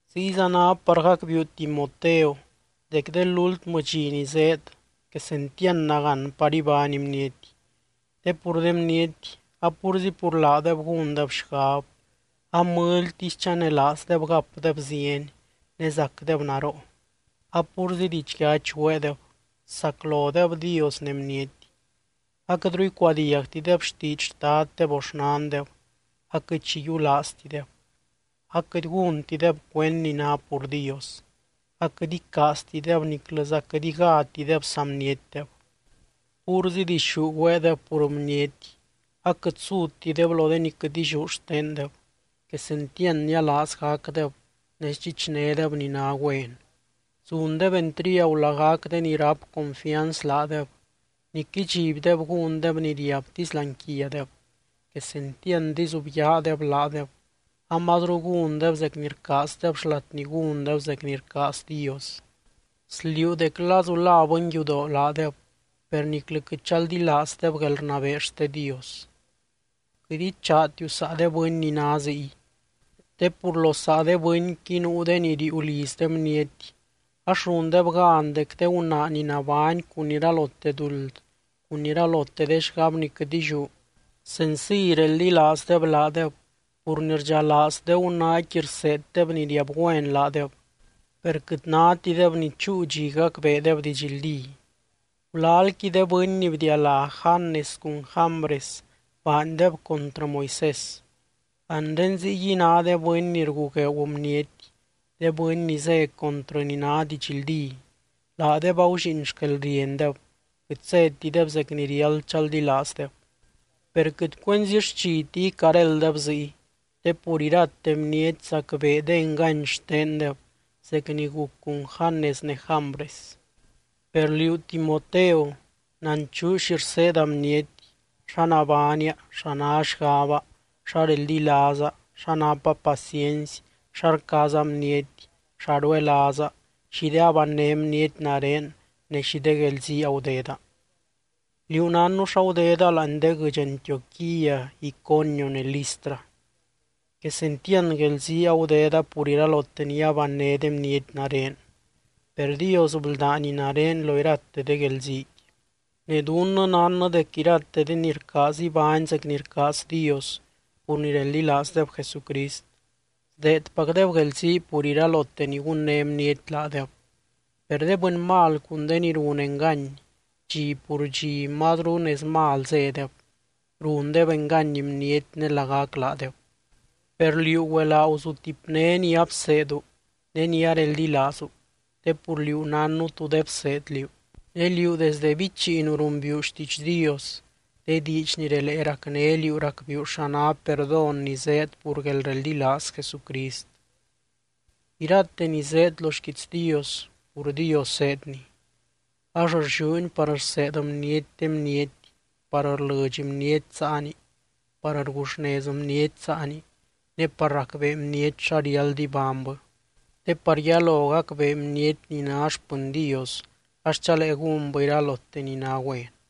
Ziyza ná par gacbiiu Timoteo dec de lúltmɨ dxi ni zéed, quesentiand nagán par ibány bniety. Te pur de bniety, a púrzi pur laadeb gúndeb xgab, a mɨlytisy chanelaazdeb gapdeb zieny, ne zacdeb naroo, a púrzi didxyachy güeedeb, saclodeb Dios ne bniety. Aquɨtru icuadiagtideb xtiidx xtaddeb o xnandeb, aquɨt xi yiulaaztideb, aquɨt gúntideb cuend ni ná pur Dios, aquɨt icaaztideb niclɨza quɨt igátideb saa bnietdeb. Púrzi dixú güeedeb pur bniety, aquɨt sutideb lo de ni quɨt illiú xtendeb, quesentiand nialaaz gacdeb, ne sdxichnédeb ni ná güen. Zundeb entriagu lagac de ni ráp confianz laadeb, nic idxibdeb gúndeb ni riabtisy láani quiadeb, quesentiand izubyaadeb laadeb, amazru gúndeb zec ni rcaazdeb xlat ni gúndeb zec ni rcaaz Dios. Sliuu dec lazu la bɨnyudoo laadeb, per niclɨ quɨt chaldilaazdeb guelrnabee xte Dios. Quɨt ichaatiu saa de bɨny ni ná ziy. Te pur lo saa de bɨnqui nuu de ni riiu liz de bniety, ax rundeb gan dec de gunaa ni nabány cun iralote duld, cun iralote de xgab ni quɨt illiú, senciy reldilaazdeb laadeb pur ni rdxalaaz de gunaaqui rseeddeb ni riab güen laadeb, per quɨt nátideb ni chúu dxi gacbeedeb didxldí. Gulalqui de bɨny ni bdialá Janes cun Jambres baandeb contrɨ Moisés. Anre ziyguiy ná de bɨny ni rgugueeu bniety, de bɨny ni zé contrɨ ni ná didxldí, laadeb agullíin xquelriendeb, quɨt zétideb zec ni riáld chaldilaazdeb. Per quɨt cuenzi xchiti icarélddeb ziy, te pur irate bniety zacbee de engany xtendeb zec ni guc cun Janes ne Jambres. Per liú Timoteo, nanchuu xi rseeda bniety, xa nabánia, xa ná xgaba, xa reldilaaza, xa napa paciency, xa rcaaza bniety, xa ruelaaza, xi de abanné bniety nare ne xi de guelzii agudeda. Liú nánnu xa gudeda láani de guɨdx Antioquía, Iconio ne Listra. Quesentiand guelzii agudeda pur iralote ni abanné de bniety nare, per Dios bldány nare lo irate de guelziiqui. Ne dunnɨ nánnɨ dec irate de ni rcaaz ibány zec ni rcaaz Dios pur ni reldilaazdeb Jesucrist, sdeedpacdeb guelzii pur iralote ni gunné bniety laadeb. Per de bɨny mal cun de ni run engany, dxi pur dxi mazru nez mal zédeb, rundeb engany bniety ne lagac laadeb. Per liú güelaa guzutipné ni abseedu, ne ni areldilaazu, te pur liú nánnu tú de bseed liú. Ne liú desde bichiinu rumbiiu xtiidx Dios, de diidx ni relee racné liú racbiiu xa ná perdón ni zéed pur guelreldilaaz Jesucrist. Irate ni zéed lo xquiits Dios, pur Dios zéedni. Ax rlliúni par rseed bniety de bniety, par rlɨdx bniety saani, par rguxnez bniety saani, ne par racbee bniety xa riáld ibánybɨ, te par yalo gacbee bniety ni ná xpɨny Dios ax chalee gúnbɨ iralote ni ná güen.